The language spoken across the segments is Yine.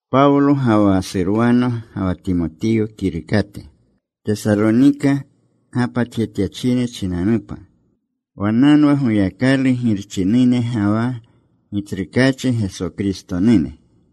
Pawlo ga wa Surwano ga wa Timotiyo kirukate, Tesalonika gapatjetyachine chinanupa. Wannanwa Goyakalu Girchinune ga wa Gitsrukaachi Geso Kristonune.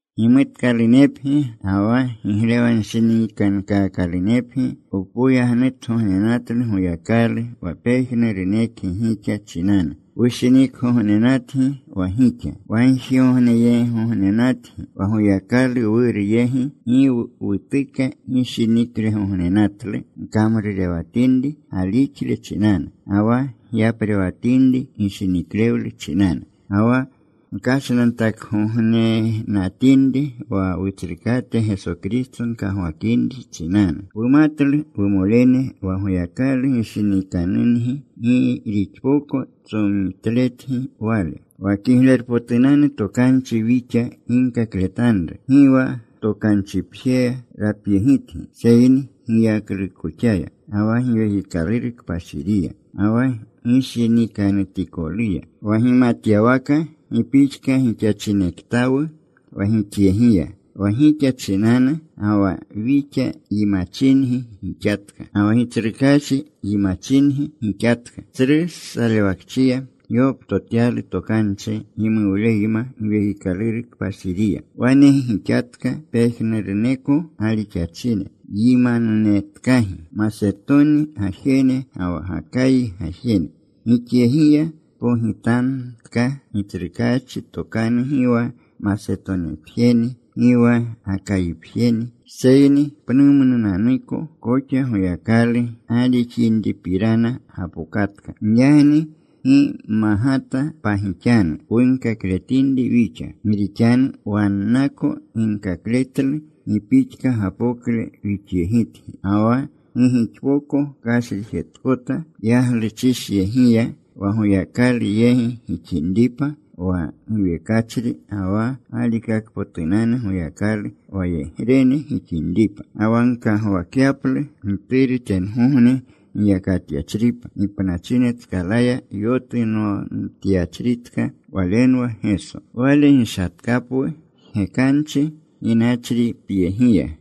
Gimutkalunepgi ga wa giglewanshinikankaakalunepgi. Wpoyagnutgognenatlu Goyakalu wa pejnurunekgi gixa chinanu. Wushinikgognenatgi wa gixa wagjigogneyegigognenatgi. Wa Goyakalu Wuru yegi gi wutuka gishinklegognenatlu gkamrurewatinri galixle chinanu, ga wa gyaprewatinri gishiniklewle chinanu, ga wa gkashnantaklewgognenatinri wa Wutsrukate Geso Kristo gkagwakinri chinanu. Wumatlu, wumolene, wa Goyakalu gishinikanungi, gi rixpoko tsomitletgi Wale. Wa Kiglerpotunanu Tokanchi wixa ginkakletanru, gi wa tokanchipjeya rapyegitgi, seyni giyaklukoxaya, ga wa Giwekikaluru Kpashiriya, ga wa gishinikanutikoluya. Wa gimatyawaka gi pixka gixachinektawu wa gixyegiya wa gixa chinanu. Ga wa wixa yimachingi gixatka, ga wa Gitsrukaachi yimachingi gixatka. Tsru salewakchiya gyoptotyalu tokanchi gimuwleyma Giwekikaluru Kpashiriya. Wane gixatka pejnuruneko galixachine, yimananunetkagi, Masetoni gajene ga wa Gakayi gajene. Gixyegiya pogitamtka Gitsrukaachi tokanu gi wa Masetonipjeni, gi wa Gakayipjeni, seyni pnumnunanuko koxa Goyakalu galixinripirana gapokatka. Giyagni gi magata pagixanu wunkakletinri wixa. Gi rixanu wannako ginkakletlu gi pixka gapokle wixyegitgi, ga wa gi gixpoko kashrijetkota yagluchishyegiya wa Goyakalu yegi gixinripa, wa giwekachri ga wa galikakpotunanu Goyakalu wayegrene gixinripa, ga wa gkagwakyaplu Gituru tengogne giyakatyachripa, gipnachine tskala yotunomtyachritka. Walenwa Geso. Wale gishatkapwu jgekanchi ginachripyegiya.